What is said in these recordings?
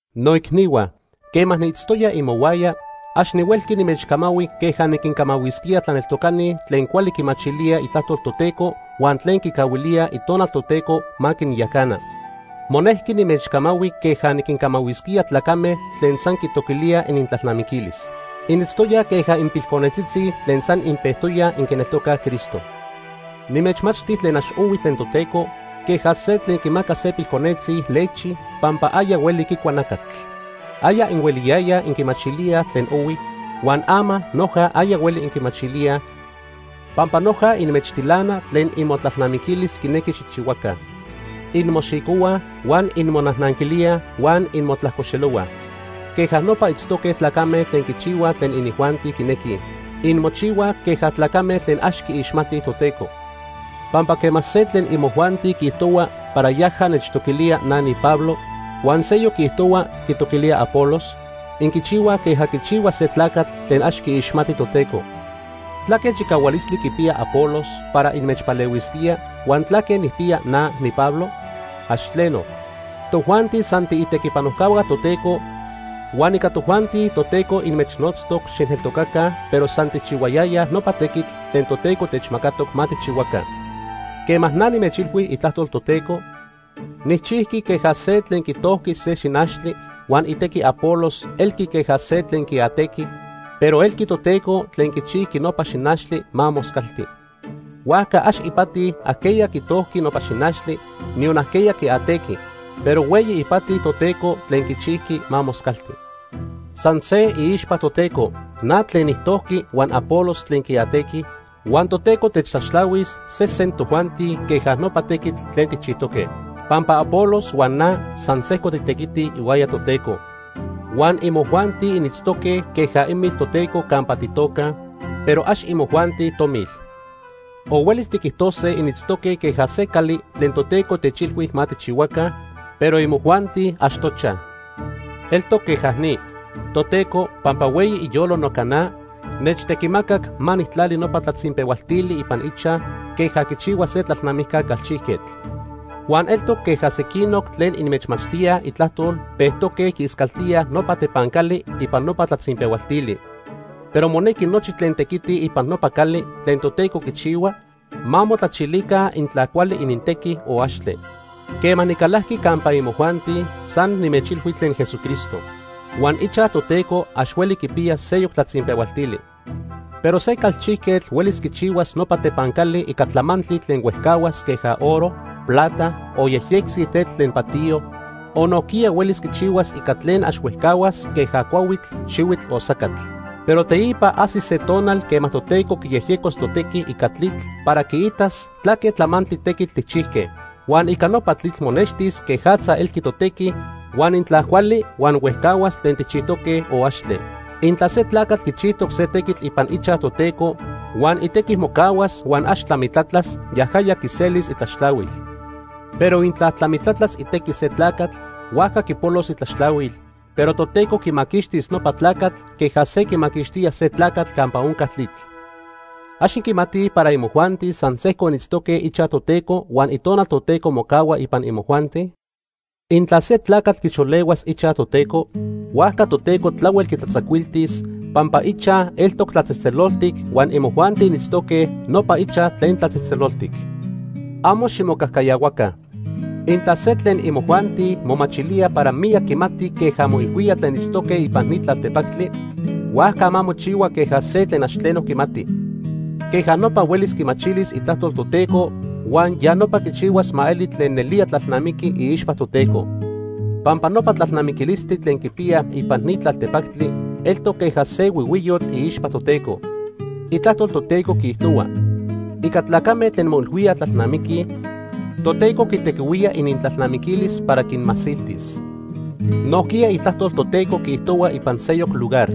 Noicnihua, quema niitztoya imohuaya, ax nihuelqui nimechcamahui queja niquincamahuisquía tlaneltocani tlen cuali quimachilíaj Itlajtol Toteco huan tlen quicahuilíaj Itonal Toteco ma quinyacana. Monejqui nimechcamahui queja niquincamahuisquía tlacame tlen san quitoquilíaj inintlalnamiquilis. Initztoyaj queja inpilconetzitzi tlen san inpejtoyaj inquineltocaj Cristo. Nimechmachti tlen ax ohui tlen Toteco, queja se tlen quimaca se pilconetzi lechi pampa aya hueli quicua nacatl. Aya inhueliyayaj inquimachilíaj tlen ohui, huan ama noja aya hueli inquimachilíaj, pampa noja inmechtilana tlen imotlalnamiquilis quinequi xijchihuaca. Inmoxicohuaj huan inmonajnanquilíaj huan inmotlajcoxelohuaj. Queja nopa itztoque tlacame tlen quichihuaj tlen inijuanti quinequij. Inmochihuaj queja tlacame tlen ax quiixmatij Toteco. Pampa quema se tlen imojuanti quiijtohua para yaja nechtoquilía na niPablo, huan seyoc quiijtohua quitoquilía Apolos, inquichihuaj queja quichihua se tlacatl tlen ax quiixmati Toteco. ¿Tlaque chicahualistli quipiya Apolos para inmechpalehuisquía huan tlaque nijpiya na, niPablo? ¡Ax tleno! Tojuanti san tiitequipanojcahua Toteco huan ica tojuanti Toteco inmechnotztoc xijneltocaca, pero san tijchihuayayaj nopa tequitl tlen Toteco techmacatoc ma tijchihuaca. Quema na nimechilhui itlajtol Toteco, nijchijqui queja se tlen quitojqui se xinachtli, huan itequi Apolos elqui queja se tlen quiatequi, pero elqui Toteco tlen quichijqui nopa xinachtli ma moscalti. Huajca ax ipati ajqueya quitojqui nopa xinachtli, niyon ajqueya quiatequi, pero hueyi ipati Toteco tlen quichijqui ma moscalti. San se iixpa Toteco na tlen nijtojqui huan Apolos tlen quiatequi, huan Toteco techtlaxtlahuis sesen tojuanti queja nopa tequitl tlen tijchijtoque. Pampa Apolos huan na san sejco titequitij ihuaya Toteco. Huan imojuanti initztoque queja imil Toteco campa titocaj, pero ax imojuanti tomil. O huelis tiquijtose initztoque queja se cali tlen Toteco techilhui ma tijchihuaca, pero imojuanti ax tochaj. Eltoc queja ni. Toteco, pampa hueyi iyolo noca na, nechtequimacac ma nijtlali nopa tlatzinpehualtili ipan ichaj queja quichihua se tlalnamijca calchijquetl. Huan eltoc queja sequinoc tlen inmechmachtíaj Itlajtol pejtoque quiiscaltíaj nopa tepancali ipan nopa tlatzinpehualtili. Pero monequi nochi tlen tequitij ipan nopa cali tlen Toteco quichihua, ma motlachilica intla cuali inintequi o axtle. Quema nicalajqui campa imojuanti, san nimechilhui tlen Jesucristo. Huan ichaj Toteco ax hueli quipiya seyoc tlatzinpehualtili. Pero se calchijquetl huelis quichihuas nopa tepancali ica tlamantli tlen huejcahuas queja oro, plata, o yejyectzi tetl tlen patiyo, o nojquiya huelis quichihuas ica tlen ax huejcahuas queja cuahuitl, xihuitl o sacatl. Pero teipa ajsis se tonal quema Toteco quiyejyecos totequi ica tlitl para quiitas tlaque tlamantli tequitl tijchijque. Huan ica nopa tlitl monextis quejatza elqui totequi huan intla cuali huan huejcahuas tlen tijchijtoque o axtle. Intla se tlacatl quichijtoc se tequitl ipan ichaj Toteco huan itequi mocahuas huan ax tlamitlatlas, yajaya quiselis itlaxtlahuil. Pero intla tlamitlatlas itequi se tlacatl, huajca quipolos itlaxtlahuil, pero Toteco quimaquixtis nopa tlacatl queja se quimaquixtía se tlacatl campa onca tlitl. ¿Ax inquimatij para imojuanti san sejco initztoque ichaj Toteco huan Itonal Toteco mocahua ipan imojuanti? Intla se tlacatl quixolehuas ichaj Toteco, huajca Toteco tlahuel quitlatzacuiltis, pampa ichaj eltoc tlatzejtzeloltic huan imojuanti initztoque nopa ichaj tlen tlatzejtzeloltic. Amo ximocajcayahuaca. Intla se tlen imojuanti momachilía para miyac quimati queja moilhuíaj tlen itztoque ipan ni tlaltepactli, huajca ma mochihua queja se tlen ax tleno quimati. Queja nopa huelis quimachilis Itlajtol Toteco huan ya nopa quichihuas ma eli tlen nelía tlalnamiqui iixpa Toteco. Pampa nopa tlalnamiquilistli tlen quipiyaj ipan ni tlaltepactli eltoc queja se huihuiyotl iixpa Toteco. Itlajtol Toteco quiijtohua: “Ica tlacame tlen moilhuíaj tlalnamiquij, Toteco quitequihuía inintlalnamiquilis para quinmasiltis.” Nojquiya Itlajtol Toteco quiijtohua ipan seyoc lugar: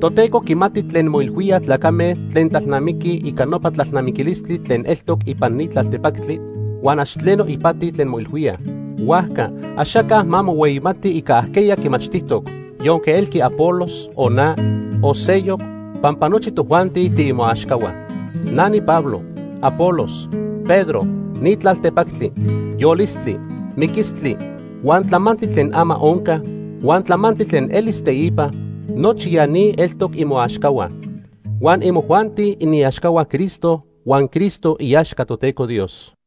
“Toteco quimati tlen moilhuíaj tlacame tlen tlalnamiquij ica nopa tlalnamiquilistli tlen eltoc ipan ni tlaltepactli, huan ax tleno ipati tlen moilhuíaj.” Huajca axaca ma mohueyimati ica ajqueya quimachtijtoc, yonque elqui Apolos, o na, o seyoc, pampa nochi tojuanti tiimoaxcahua. Na niPablo, Apolos, Pedro, ni tlaltepactli, yolistli, miquistli, huan tlamantli tlen ama onca, huan tlamantli tlen elis teipa; nochi ya ni eltoc imoaxcahua. Huan imojuanti iniaxcahua Cristo huan Cristo iaxca Toteco Dios.